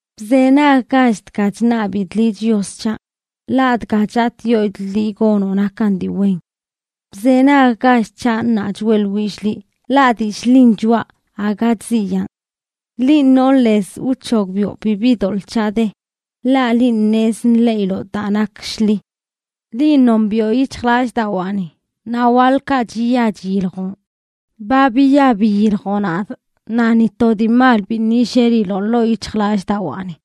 Bzenaggach dga chṉabidꞌ liꞌ, Chios c̱haꞌ, ḻaꞌ dga chatꞌyoidꞌ liꞌ gonoꞌ nakan dii wen. Bzenaggach c̱haꞌ ṉaa choeꞌḻwillꞌ liꞌ, ḻaꞌ dillꞌ ḻin choꞌa, aga chziyaan. Linꞌ nonꞌ lez wc̱hogbiꞌo bibi doḻꞌ c̱haꞌ de; ḻaꞌ linꞌ ṉez nḻeꞌiloꞌ daa nak shḻi. Linꞌ nombiꞌo yic̱hjlallꞌdawaani, naꞌ waḻkaꞌ chiya chiyiljoꞌn. Ba biya biyiljoꞌ nadꞌ naꞌ ni to dii mal biṉꞌ yilleliloꞌ ḻoo yic̱hjlallꞌdawaani.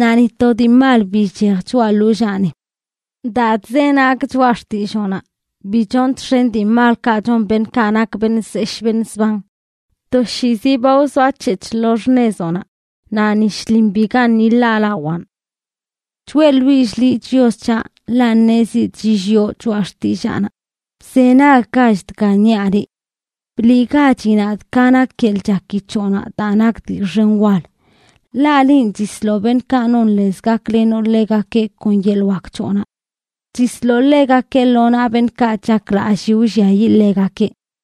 Naꞌ ni to dii mal bi chchej choꞌa ḻollaani. Daa chzenagꞌ choꞌa xtilloonaꞌ, bi chonꞌ txen dii malkaꞌ chon beṉꞌkaꞌ nak beṉꞌ zeshꞌ beṉꞌ zban. Toshiizi ba wzoac̱hec̱hꞌ lo xṉezoꞌnaꞌ, naꞌ ni shlin bigaṉꞌ yiḻaalawaan. Choeꞌḻwillꞌ liꞌ, Chios c̱haꞌ, ḻaꞌ ṉezidꞌ chilliꞌo choꞌa xtillaanaꞌ. Bzenaggach dga niaꞌ liꞌ. Bliꞌgachi nadꞌ ka nak yeḻꞌ chaki c̱hoꞌnaꞌ daa nak dii xen wal, ḻaꞌ linꞌ, chisloꞌ beṉꞌkaꞌ non lez gaklenoꞌ ḻegakeꞌ kon yeḻꞌ wak c̱hoꞌnaꞌ. Chisloꞌ ḻegakeꞌ lo naꞌ beṉꞌkaꞌ chaklallii wlliayiꞌ ḻegakeꞌ.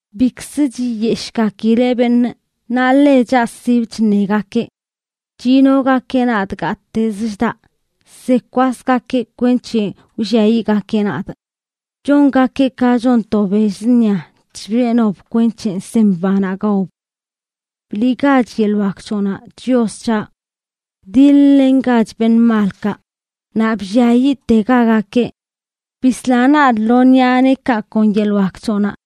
Bikzə chiyeshꞌgakileꞌ beṉꞌ, naꞌ ḻe chaꞌsibə chṉegakeꞌ. Chinogakeꞌ nadꞌ gattezə chdaꞌ, zekwasgakeꞌ kwenc̱he wlliayiꞌgakeꞌ nadꞌ. Chongakeꞌ ka chon to bell zṉia chbeꞌnob kwenc̱he sem banaꞌ gaob. ¡Bliꞌgach yeḻꞌ wak c̱hoꞌnaꞌ, Chios c̱haꞌ! Wdiḻ-lengach beṉꞌ malkaꞌ naꞌ blliayiꞌtegagakeꞌ. Bisla nadꞌ lo ṉiꞌa neekaꞌ kon yeḻꞌ wak c̱hoꞌnaꞌ.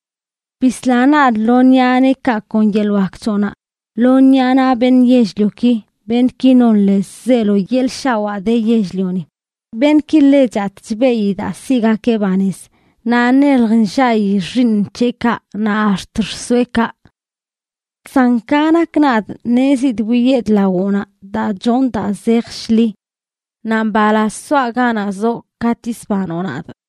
Bisla nadꞌ lo ṉiꞌa neekaꞌ kon yeḻꞌ wak c̱hoꞌnaꞌ, lo ṉiꞌa naꞌ beṉꞌ yell-lioki, beṉꞌki non lez zeelo yeḻꞌ shawaa de yell-lioni; beṉꞌki ḻe chatꞌ chbeꞌyi daa siꞌgakeꞌ banez, naꞌ nelj nllaꞌyi xiiṉ c̱heꞌkaꞌ naꞌ ax̱t xsoeꞌkaꞌ. San ka nak nadꞌ, ṉezidꞌ wiyedꞌ lawoꞌnaꞌ daa chonꞌ daa zej shḻi. Naꞌ mbalaz soaꞌ ganaꞌ zoꞌ katꞌ yisbanoꞌ nadꞌ.